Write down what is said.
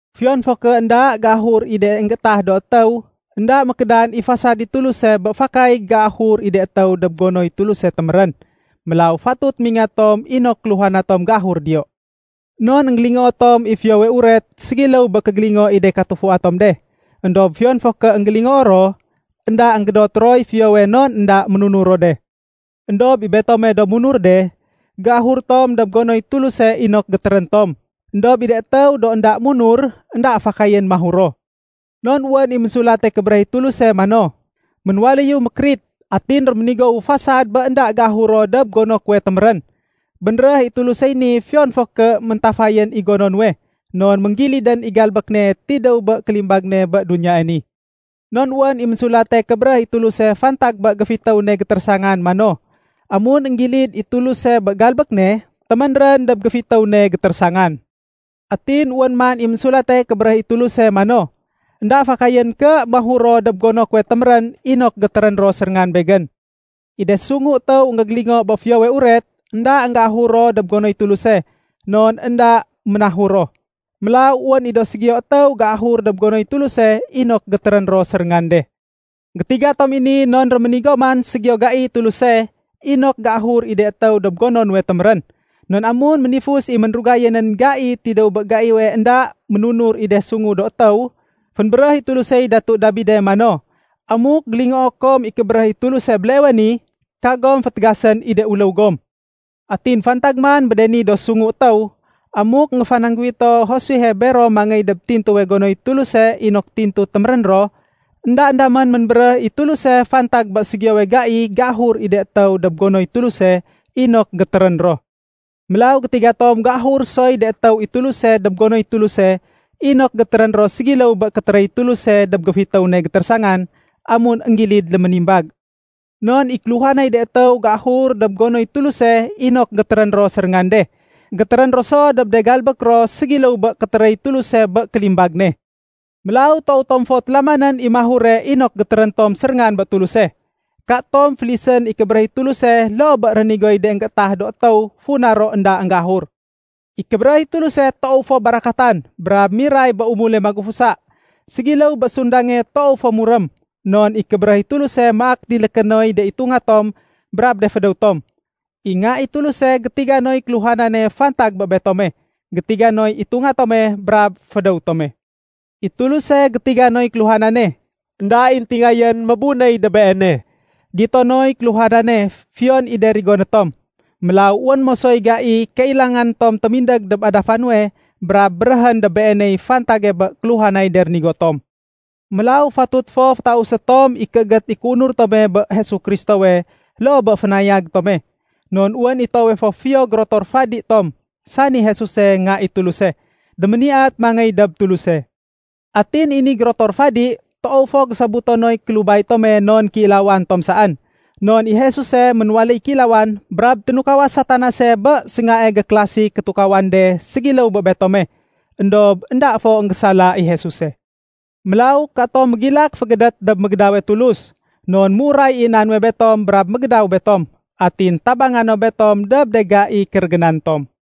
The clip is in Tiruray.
Fiyon fo ké énda géahur i de énggétah do étéw, énda mékédan i fasad i Tuluse bé fakay géahur i de étéw dob gonoy Tuluse témérén. Mélaw fatut mingat tom inok kéluhana tom géahur diyo. Non énggélingoo tom i Fiyowe Uret ségiléw bé kégégélingo i de katufua tom de. Endob fiyon fo ké énggélingoo ro, énda énggédot roy fiyowe non énda ménunur ro de. Endob i betome do munur de, géahur tom dob gonoy Tuluse inok gétérén tom. Endob i de étéw do énda munur, énda fakayén mahur ro. Non wén i Ménsulate Kébéréh i Tuluse mano, “Ménwaléyu mékérit, atin réménigowu fasad bé énda géahur ro dob gono kuwe témérén.” Bénréh i Tulusey ni fiyon fo ké méntafayén i gono nuwe, non ménggilidén i galbék ne tidéw bé kélimbag ne bé duniyae ni. Non wén i Ménsulate Kébéréh i Tuluse fantag bé géfitéw ne gétérésangan mano, “Amun énggilid i Tuluse bé galbék ne, téménrén dob géfitéw ne gétérésangan.” Atin wén man i Ménsulate Kébéréh i Tuluse mano, “Enda fakayén ké mahur ro dob gono kuwe témérén inok gétérén ro séréngan Begén.” I de sungu étéw énggégélingo bé Fiyowe Uret, énda énggéahur ro dob gonoy Tuluse, non énda ménahur ro. Mélaw wén i do ségiyo étéw géahur dob gonoy Tuluse inok gétérén ro séréngan de. Gétiga tom i ni non réménigo man ségiyo gaiy Tuluse inok géahur i de étéw dob gono nuwe témérén. Non amun ménifus i ménrugaye nén gai tidéw bé gaiwe énda ménunur i de sungu do étéw, fénbéréh i Tulusey Datu Dabide mano, “Amuk gélingoo kom i kébéréh i Tuluse béleewe ni, kagom fétégasén i de uléw gom.” Atin fantag man bé de ni do sungu étéw, amuk énggéfanangguwito Josuehe bero mangéy dob tintuwe gonoy Tuluse inok tintu gétérén ro, éndaén damén ménbéréh i Tuluse fantag bé ségiyowe gai géahur i de étéw dob gonoy Tuluse inok gétérén ro. Mélaw gétiga tom géahur soy de étéw i Tuluse dob gonoy Tuluse inok gétérén ro ségiléw bé kétéréy Tuluse dob géfitéw ne gétérésangan amun énggilid léménimbag. Non i kéluhanay de étéw géahur dob gonoy Tuluse inok gétérén ro séréngan de, gétérén ro so dob de galbék ro ségiléw bé kétéréy Tuluse bé kélimbag ne. Mélaw toow tom fo télamanén i mahure inok gétérén tom séréngan bé Tuluse. Katom félisén i kébéréh i Tuluse loo bé rénigoy de énggéétah do étéw funa ro énda énggéahur. I kébéréh i Tuluse toow fo barakatan brab miray bé umule magufusa. Ségiléw bé sundange toow fo murém. Non i kébéréh i Tuluse maak diléké noy de itunga tom brab de fédéw tom. I Nga i Tuluse gétiga noy kéluhanane fantag bé betome. Gétiga noy itunga tome brab fédéw tome. I Tuluse gétiga noy kéluhanane, énda i éntingayén mébunéy dob Beene. Gito noy kéluhanane, fiyon i de rigoné tom. Mélaw wén mosoy gai kailanga tom témindég dob adafa nuwe brab béréhén dob Beeney fantag bé kéluhanay de rénigo tom. Mélaw fatut fo fétausé tom i kéégét i kéunur tome bé Jesu Kristowe loo bé fénayag tome. Non wén i toowe fo fiyo gérotor fadi tom, sani Jesuse Nga i Tuluse, déméniyat mangéy dob Tuluse. Atin i ni gérotor fadi, toow fo gésobuto noy kélubay tome non kéilawan tom saén. Non i Jesuse ménwaléy kéilawan brab ténukaw Satanase bé séngae gékélasi kétukawan de ségiléw bé betome, éndob énda fo énggésala i Jesuse. Mélaw, katom mégilak fégédét dob mégédawe Tulus. Non méuray i na nuwe betom brab mégédaw betom, atin tabanga no betom dob de gai kérégénan tom.